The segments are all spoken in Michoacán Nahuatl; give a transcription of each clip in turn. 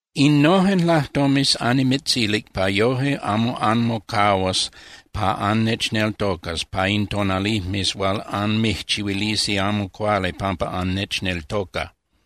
’Innojen lajtomes annimitzilic pa yoje amo anmocahuas pa annechneltocas pa in tonalijmes hual anmijchihuilisi amo cuali pampa annechneltoca.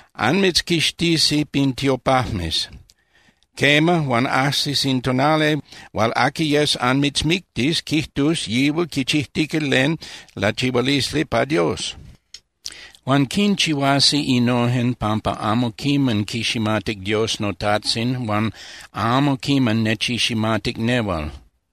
Anmitzquixtisi pin tiopajmes. Quema, huan ajsis in tonali hual aqui yes anmitzmictis quijtus yihual quichijtica len lachihualisli pa Dios. Huan quinchihuasi innojen pampa amo quiman quiximatic Dios noTajtzin huan amo quiman nechiximatic nehual.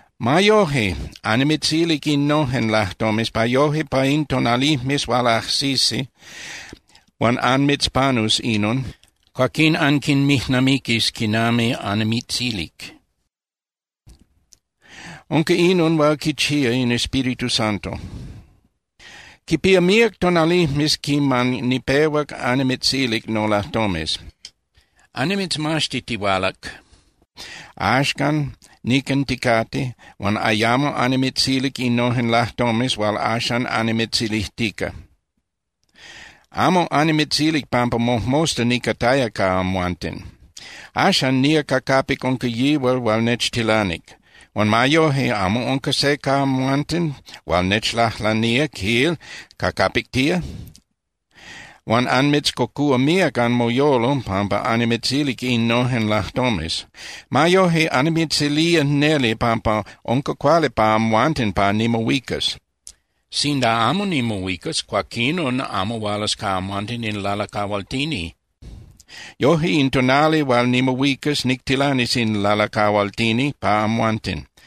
Ma yoje, annimitzilic innojen lajtomes, pa yoje pa in tonalijmes hual ajsisi, huan anmitzpanus inon, cuaquín anquinmijnamiquis quinami annimitzilic. Unca inon hual quichía in Espíritu Santo. ’Quipía míac tonalijmes quiman nipehuac annimitzilic nolajtomes. Annimitzmaxtitihualac, axan nican ticate, huan ayamo annimitzilic innojen lajtomes hual axan annimitzilijtica. Amo annimitzilic pampa mojmosta nicataya ca amhuanten. Axan nía ca capic unca yihual hual nechtilanic, huan ma yoje, amo unca se ca amhuanten hual nechlajlanía, quil, ¿ca capic tía? Huan anmitzcocúa míac anmoyolo pampa annimitzilic innojen lajtomes. Ma yoje, annimitzilía neli pampa unca cuali pa amhuanten pa nimohuicas. Sinda amo nimohuicas, cuaquinon amo hualas ca amhuanten in Lalacahualtini. Yoje, in tonali hual nimohuicas, nictilanis in Lalacahualtini pa amhuanten.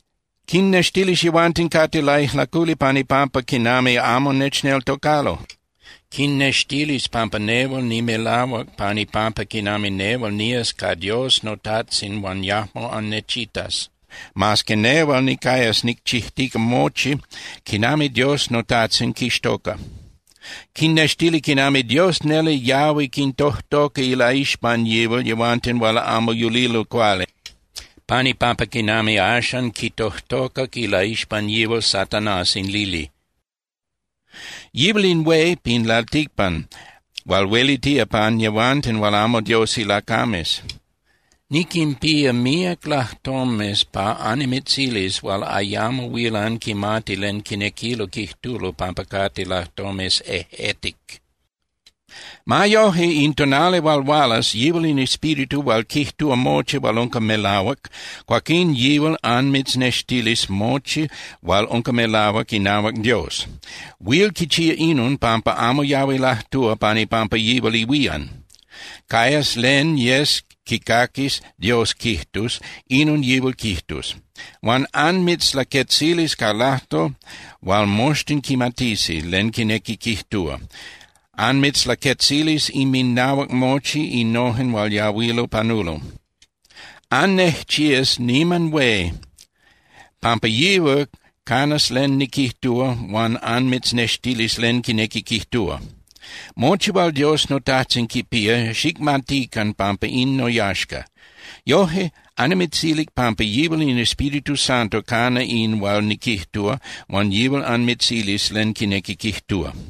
Quinnextilis yehuanten cate laijlaculi pan ipampa quinami amo nechneltocalo. Quinnextilis pampa nehual nimelahuac pan ipampa quinami nehual nías ca Dios noTajtzin huan yajmo annechitas, mas que nehual nicayas nicchijtica mochi quinami Dios noTajtzin quixtoca. Quinnextilis quinami Dios neli yahui quintojtoca ilaixpan yihual yehuanten hual amo yulilo cuali, pan ipampa quinami axan quitojtocac ilaixpan yihual Satanás in lili. Yihual in hué pin lalticpan hual huelitía pan yehuanten hual amo Dios ilacames. ’Niquinpía míac lajtomes pa annimitzilis hual ayamo huil anquimati len quinequilo quijtulo pampa cate lajtomes ejꞌetic. Ma yoje, in tonali hual hualas yihual in Espíritu hual quijtúa mochi hual unca melahuac, cuaquín yihual anmitznextilis mochi hual unca melahuac inahuac Dios. Huil quichía inon, pampa amo yahui lajtúa pan ipampa yihual ihuían. Cayas len yes quicaquis Dios quijtus, inon yihual quijtus. Huan anmitzlaquetzilis ca lajtol hual moxtin quimatisi len quinequi quijtúa, anmitzlaquetzilis inminahuac mochi innojen hual yahuilo panulo. Annejchías niman hué pampa yihual canas len niquijtúa huan anmitznextilis len quinequi quijtúa. Mochi hual Dios noTajtzin quipía, xicmatican pampa in noyaxca. Yoje, annimitzilic pampa yihual in Espíritu Santo cana in hual niquijtúa huan yihual anmitzilis len quinequi quijtúa.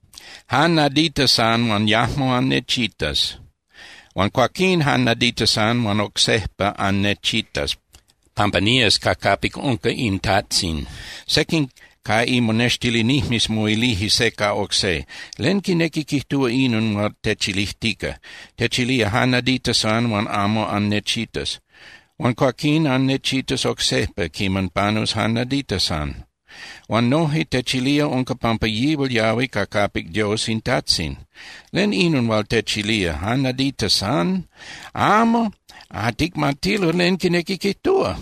’Jan nadita san huan yajmo annechitas. Huan cuaquín jan nadita san huan oc sejpa annechitas, pampa nías ca capic unca in Tajtzin. Sequin ca imonextilinijmes moilije se ca oc se: —¿Len quinequi quijtúa inon hual techilijtica? Techilía: “Jan nadita san huan amo annechitas. Huan cuaquín annechitas oc sejpa quiman panus jan nadita san.” Huan noje techilía unca pampa yihual yahui ca capic Dios in Tajtzin. ¿Len inon hual techilía: “Jan nadita san?” Amo ticmatilo len quinequi quijtúa.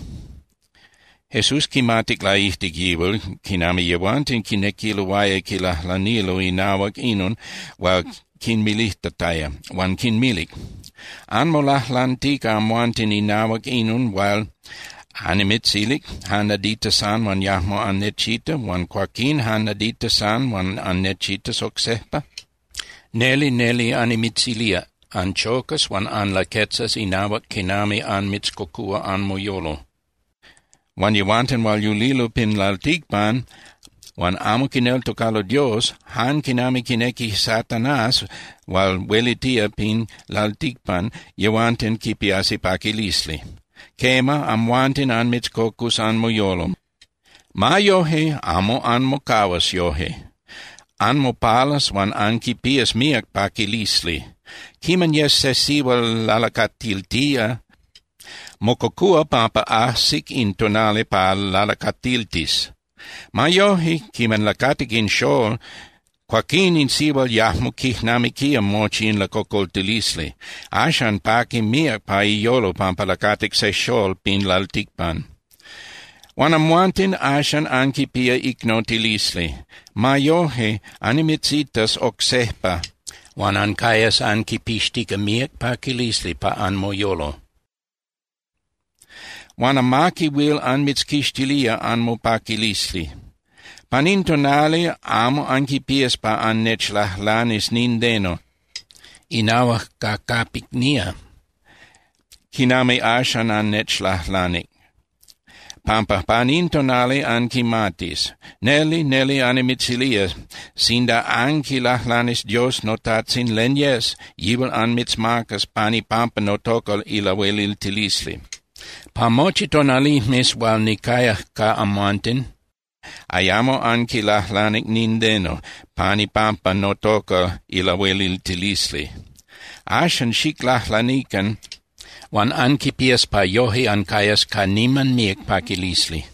Jesús quimatic laijtic yihual quinami yehuanten quinequiloaya quilajlanilo inahuac inon hual quinmilijtataya, huan quinmilic: —¿Anmolajlantica amhuanten inahuac inon hual annimitzilic: “Jan nadita san huan yajmo annechitas huan cuaquín jan nadita san huan annechitas oc sejpa”? Neli, neli annimitzilía, anchocas huan anlaquetzas inahuac quinami anmitzcocúa anmoyolo. Huan yehuanten hual yulilo pin lalticpan huan amo quineltocalo Dios, jan quinami quinequi Satanás hual huelitía pin lalticpan, yehuanten quipiasi paquilisli. Quema, amhuanten anmitzcocus anmoyolo. Ma yoje, amo anmocahuas yoje. Anmopalas huan anquipías míac paquilisli. Quiman yes se sihual lalacatiltía, mococúa pampa ajsic in tonali pa lalacatiltis. Ma yoje, quiman lacatic in xól, cuaquín in sihual yajmo quijnamiquía mochi in lacocoltilisli. Axan paqui míac pa iyolo pampa lacatic se xól pin lalticpan. Huan amhuanten axan anquipía icnotilisli. Ma yoje, annimitzitas oc sejpa huan ancayas anquipixtica míac paquilisli pa anmoyolo. Huan amaqui huil anmitzquixtilía anmopaquilisli. ’Pan in tonali amo anquipías pa annechlajlanis nindeno inahuac ca capic nía, quinami axan annechlajlanic, pampa pan in tonali anquimatis. Neli, neli annimitzilía, sinda anquilajlanis Dios noTajtzin len yes, yihual anmitzmacas pan ipampa notoca ilahueliltilisli. Pa mochi tonalijmes hual nicayac ca amhuanten, ayamo anquilajlanic nindeno pan ipampa notoca ilahueliltilisli. Axan xiclajlanican huan anquipías pa yoje ancayas ca niman míac paquilisli.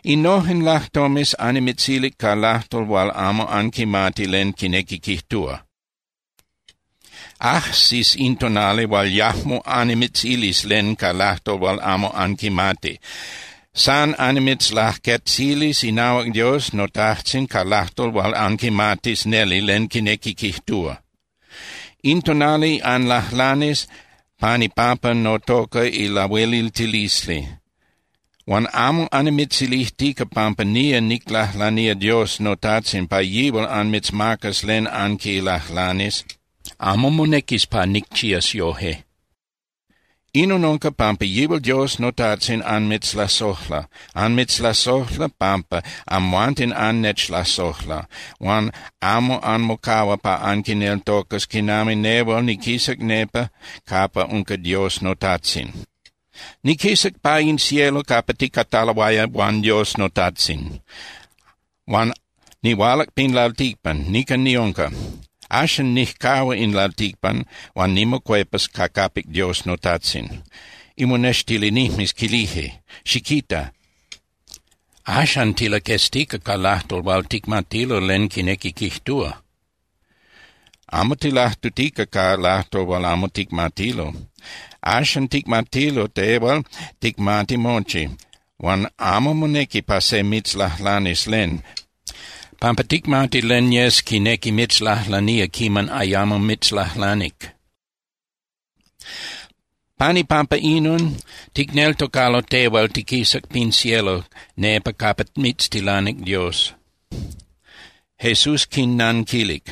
’Innojen lajtomes annimitzilic ca lajtol hual amo anquimati len quinequi quijtúa. Ajsis in tonali hual yajmo annimitzilis len ca lajtol hual amo anquimati. San annimitzlaquetzilis inahuac Dios noTajtzin ca lajtol hual anquimatis neli len quinequi quijtúa. In tonali anlajlanis pan ipampa notoca ilahueliltilisli. Huan amo annimitzilijtica pampa nía niclajlanía Dios noTajtzin pa yihual anmitzmacas len anquilajlanis. Amo monequis pa nicchías yoje. Inon unca pampa yihual Dios noTajtzin anmitzlasojla. Anmitzlasojla pampa amhuanten annechlasojla huan amo anmocahua pa anquineltocas quinami nehual niquisac nepa capa unca Dios noTajtzin. Niquisac pa in cielo capa ticataloaya huan Dios noTajtzin, huan nihualac pin lalticpan, nican niunca. Axan nijcahua in lalticpan huan nimocuepas ca capic Dios noTajtzin. Imonextilinijmes quilije: —Xiquita, axan tilaqueztica ca lajtol hual ticmatilo len quinequi quijtúa. Amo tilajtutica ca lajtol hual amo ticmatilo. Axan ticmatilo tehual ticmati mochi, huan amo monequi pa se mitzlajlanis len, pampa ticmati len yes quinequi mitzlajlanía quiman ayamo mitzlajlanic. Pan ipampa inon, ticneltocalo tehual tiquisac pin cielo nepa capa mitztilanic Dios. Jesús quinnanquilic: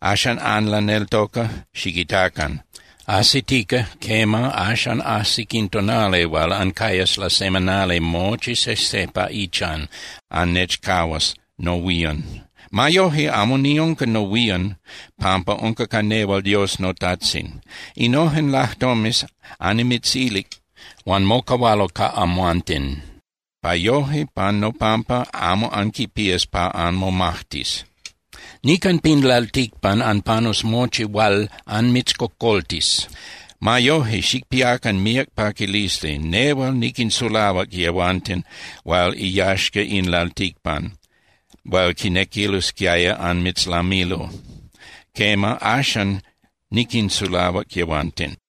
—¿Axan anlaneltoca? Xiquitacan. Ajsitica, quema, axan ajsic in tonali hual ancayas lasemanali mochi sejse pa ichan, annechcahuas nohuían. Ma yoje amo niunca nohuían, pampa unca ca nehual Dios noTajtzin. Innojen lajtomes annimitzilic, huan mocahualo ca amhuanten, pa yoje pan nopampa amo anquipías pa anmomajtis. Nican pin lalticpan anpanus mochi hual anmitzcocoltis. Ma yoje xicpiacan míac paquilisli. Nehual niquinsulahuac yehuanten hual iyaxca in lalticpan hual quinequilosquiaya anmitzlamilo. Quema, axan niquinsulahuac yehuanten.